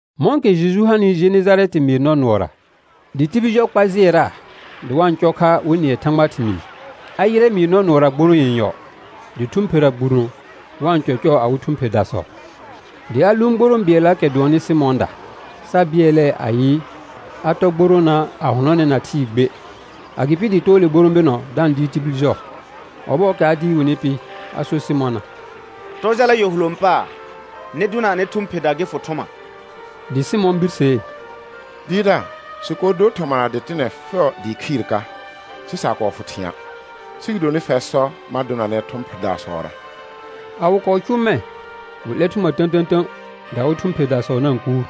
Mɔ̃kɛ Jeju hanɩ Jenejarɛtɩ mɩɩr nɔ nʋɔra, dɩ tibil jɔ kpa jɩɛraa dɩ wa-n cɔ kha wɩ nɩɛ Thãgbaa thɩmɩɩ, a yɩrɛ mɩɩr nɔ nʋɔra gborõo yenyɔ, dɩ thʋ̃ phera gbuno wa-n cɔcɔɔ awɩ thʋ̃ pherdasɔ. Dɩ a lʋʋn gborõ bɩɛllaakɛ dʋɔnnɩ Sɩmɔ̃ɔda, sa bɩɛlɛɛ ayɩ a tɔ gboroona, a hʋnɔnɛna thɩɩ gbe. Agɩpɩ dɩ too le gborõ bɩnɔ da-n dɩɩr tibil jɔ. Ɔbɔɔkɛ a dɩɩr wɩnɩ pɩ, a sor Sɩmɔna: Tɔ jala yɔ hulõ paar, nɩ dʋna anɩ thʋ̃ pherda gɩ fʋ thʋma. Dɩ Sɩmɔ̃ birsee: Dɩɩrdaar, sɩ kɔɔ dor thɔma na dɩtɩnɛ fɛʋ dɩɩ khɩɩr ka, sɩ sa kɔɔ fʋ thɩ̃a'. Sɩ gɩdonɩ fɛr sɔ, ma dʋnanɛ thʋ̃ pherdasɔra. A wɩ kɔɔ cʋʋ mɛ̃, wɩ 'lɛr thʋma tə̃tə̃tə̃, dɩ awɩ thʋ̃ pherdasɔ na-n kuur.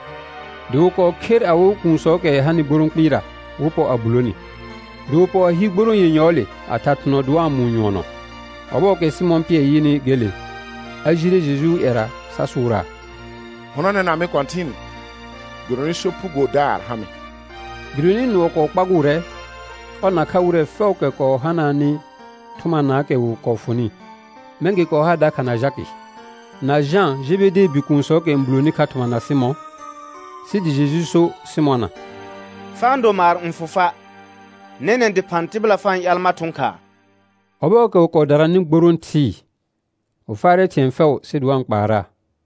Dɩ wɩ kɔɔ kher awɩ kuunsɔɔkɛ hanɩ gborõ kpɩɩra, wɩ pɔ a bulo ni. Dɩ wɩ pɔ a hi gborõo yenyɔɔle a tha thʋnɔ dɩ wa-n mʋʋ nyʋɔnɔ. Ɔbɔɔkɛ Sɩmɔ̃ Pɩɛr yɩnɩ gele, a jire Jejuu ƴɛra sa sʋʋraa: Hʋnɔnɛna mɩ Kɔ̃tɩn, gɩdonɩ sopugodaar ha mɩ. Gɩdonɩ nʋɔ kɔɔ kpagʋʋrɛ, ɔr nakha wɩrɛ fɛʋʋkɛ kɔɔ hanaanɩ thʋmanaakɛ wɩ kɔɔ fʋnɩ. Mɛ̃ gɩ kɔɔ ha dakha na Jakɩ, na Jã Jebedee bikuunsɔɔkɛ n buloni kha thɔma na Sɩmɔ̃. Sɩ dɩ Jeju so Sɩmɔna: Fa-n do maar n fʋ fa'. Nɛnɛ̃ dɩphã tɩbɩla fa-n ƴaal mar thʋ̃ khaa. Ɔbɔɔkɛ wɩ kɔɔ dananɩ gborõo thɩɩ, wɩ faarɛ thɩ̃ɛ fɛʋ sɩ dɩ wa-n kpaaraa.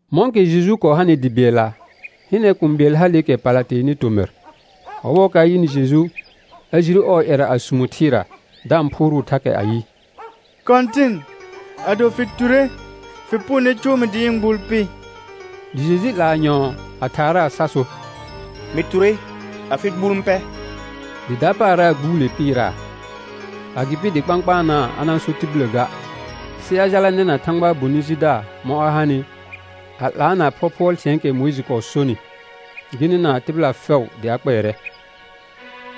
Mɔ̃kɛ Jeju kɔɔ hanɩ dɩ bɩɛlla, hɩnɛ kũu bɩɛl haleekɛ pala teenɩ tomɩr. Ɔbɔɔkɛ a yɩnɩ Jeju, a jire ɔɔ ƴɛra a sumo thɩɩra da-n phʋʋrʋʋ thakɛ ayɩ: Kɔ̃tɩn, ado fɩ ture, fɩ punone cʋʋ mɩ dɩ ɩ̃ gbuul pɩ. Dɩ Jeju 'laa nyɔ̃ɔ a thaaraa sa so: Mɩ ture afɩ gbuul n pɛ. Dɩ dapaara gbuule pɩɩraa. Agɩpɩ dɩ kpãkpaanaa a na-n so tibillə ga, sɩ a jala nɛna Thãgbaa bonɩ jidaar mɔ̃ a hanɩ, a 'laana phɔphʋɔl thɩ̃ɛɛkɛ Mʋɩjɩ kɔɔ sonɩ, gɩ nɩna tɩbɩla fɛʋ dɩ a kpɛɛrɛ.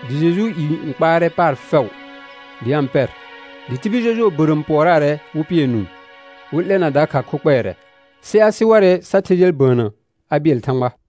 Dɩ Jejuu i n kpaarɛ paar fɛʋ dɩ a-n pɛr, dɩ tibil jɔjʋɔ bərəəm pʋɔraarɛ wɩ pɩɛ nũu, wɩ 'lɛna dakha kho kpɛɛrɛ. Sɩ a sɩ warɛ sa the jal bəənnə a bɩɛl Thãgba.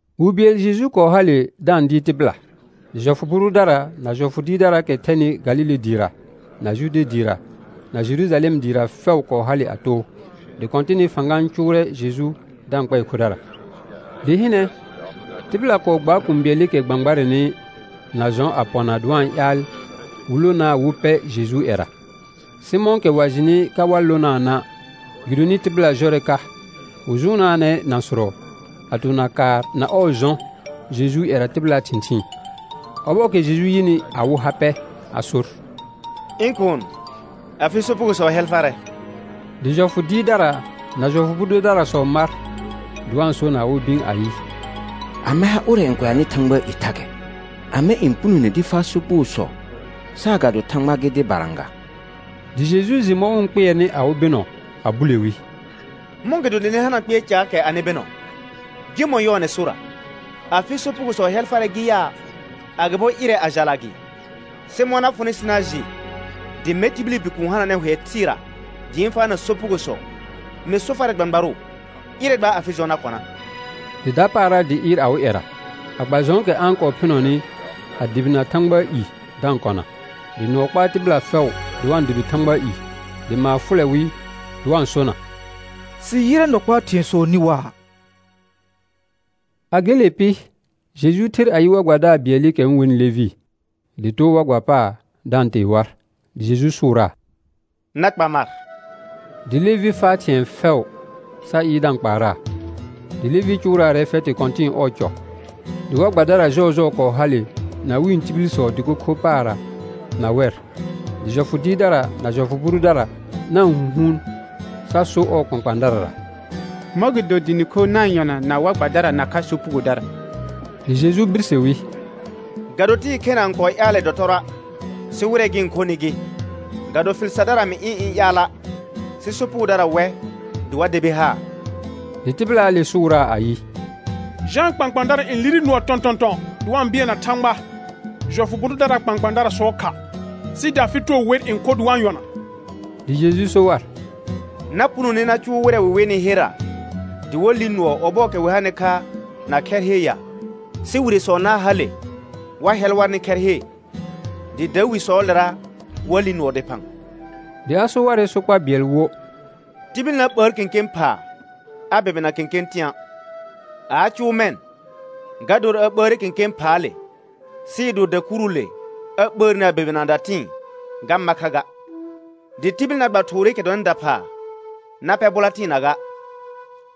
Wi bɩɛl Jeju kɔɔ hale da-n dɩɩr tɩbɩla. Dɩ jɔfʋ bʋ dʋdara na jɔfʋ dɩɩrdaraakɛ thɛnɩ Galile dɩɩra, na Jude dɩɩra, na Jerujalɛm dɩɩra fɛʋ, kɔɔ hale a too. Dɩ Kɔ̃tɩnɩ fãga n cʋʋrɛ Jeju da-n kpɛɛ khodara. Dɩ hɩnɛ, tɩbɩla kɔɔ gbaar kũu bɩɛlɩkɛ gbãgbarnɛnɩ na jɔ̃ a pɔna, dɩ wa-n ƴaal wɩ lonaa wɩ pɛ Jejuu ƴɛra. Sɩ mɔ̃kɛ wa jɩnɩ ka wa lonaana', gɩdonɩ tɩbɩla jɔrɛ ka, wɩ jʋʋnaanɛ nãsʋrɔ a tona kaar na ɔɔ jɔ̃ Jejuu ƴɛra tɩbɩlaa thɩ̃thɩɩn. Ɔbɔɔkɛ Jeju yɩnɩ awɩ ha pɛ a sor: Ɩ̃ kuun, afɩ sopugosɔ hɛl farɛ. Dɩ jɔfʋ dɩɩrdara na jɔfʋ bʋ dʋdarasɔ mar dɩ wa-n so na awɩ bɩ̃ ayɩ: Amɛ ha ʋrɛ n kʋɛanɩ Thãgbaa i thakɛ? Amɛ n punone dɩ faa sopugosɔ saagado Thãgba gɩ dɩbara ga? Dɩ Jeju jɩ mɔ̃ wɩ-n kpɩɛrnɩ awɩ bɩnɔ, a bule wi: Mɔ̃gɩdo dɩ nɩ hana kpɩɛr caakɛ anɩ bɩnɔ? Gɩmɔ̃ yɔɔnɛ sorra: Afɩ sopugosɔ hɛl farɛ gɩ yaa, agɩbo: Ɩrɛ a jala gɩ? Sɩ mɔ̃ na fʋnɩ sɩ na jɩ, dɩ mɛr tibili Bikuun hananɛ hʋɛ thɩɩra dɩ ɩ̃ faana sopugosɔ, mɩ so farɛ gbãgbarʋ, ɩrɛ gba afɩ jɔ̃ na kɔna. Dɩ dapaara dɩ ɩɩr awɩ ƴɛra a gba jɔ̃ɔkɛ a-n kɔɔ phɩnɔnɩ, a dʋbɩna Thãgbaa i da-n kɔna. Dɩ nʋɔ kpaa tɩbɩla fɛʋ dɩ wa-n dʋbɩ Thãgbaa i, dɩ maar fʋlɛ wɩ dɩ wa-n sona: Sɩ yɩrɛ nɔ kpaa thɩ̃ɛsɔ nĩ waa. A gele pɩ, Jeju ther a yɩ war gbadaar bɩɛlɩkɛ wɩ-n wenɩ Levɩ, dɩ too war gba paar da-n tee war. Dɩ Jeju sʋʋraa: Na kpa mar. Dɩ Levɩ faa thɩ̃ɛ fɛʋ sa ɩɩr da-n kpaaraa. Dɩ Levɩ cʋʋraarɛ fɛtɩ kɔ̃tɩ̃ɩ ɔɔ cɔ. Dɩ war gbadara jɔɔjɔɔ kɔɔ hale na wɩ̃ tibilsɔ dɩko kho paarra na wɛr. Dɩ jɔfʋ dɩɩrdara na jɔfʋ bʋ dʋdara na-n hũhuun sa so ɔɔ kpãkpãadarara: Mɔ̃gɩdo dɩ nɩ kho na-n yɔna na war gbadara nakha sopugodara? Dɩ Jeju birse wi: Ga do tɩɩ khena n kɔɔ ƴaalɛ dɔtɔrɔa', sɩ wɩrɛ gɩ-n khonɩ gɩ. Ga do fɩl sardara mɩ ɩ̃ ɩ̃ ƴaala', sɩ sopugodara wɛ dɩ wa debi haar. Dɩ tɩbɩlaale sʋʋraa ayɩ: Jãa kpãkpãadara n lire nʋɔ tɔ̃tɔ̃tɔ̃ dɩ wa-n bɩɛlna Thãgba jɔfʋ bʋ dʋdaraa kpãkpãadarasɔɔ kha, sɩ dɩ afɩ too wer n kho dɩ wa-n yɔna. Dɩ Jeju so war: Na punone na cʋʋ wɩrɛ wɩ wenɩ herra dɩ wa li nʋɔ, ɔbɔɔkɛ wɩ hanɩ kha na khɛr he ya? Sɩ wiresɔ na hale wa hɛl warnɩ khɛr he, dɩ dawisɔɔlera wa li nʋɔ dɩphã. Dɩ a so warɛ sokpa bɩɛl wo: Tibil na ɓəər kẽkẽ phaa a bɛbɩna kẽkẽ tɩ̃a'. A a cʋʋ mɛ̃, ga dor a ɓəəre kẽkẽ phaale, sɩɩ do dakuruule a ɓəərni a bɛbɩna datɩ̃ɩ, ga ma kha ga. Dɩ tibil na gba thʋʋrɩkɛ dɔnɩ daphaa na pɛr bʋla tɩɩna ga.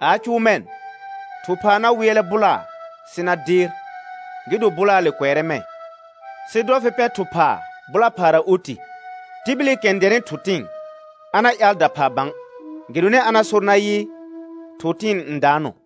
A a cʋʋ mɛ̃, thʋ phaa na wɩɛlɛ bʋlaa sɩ na deer, gɩ do bʋlaale kʋɛrɛ mɛ̃. Sɩ dɔ fɩ pɛ thʋ phaa bʋla phaara oti. Tibilikɛ n dɛnɩ thʋ tɩ̃ɩ, a na ƴaal daphaa bã, gɩdonɩ a na sor nayɩ, thʋ tɩ̃ɩ n daanɔ.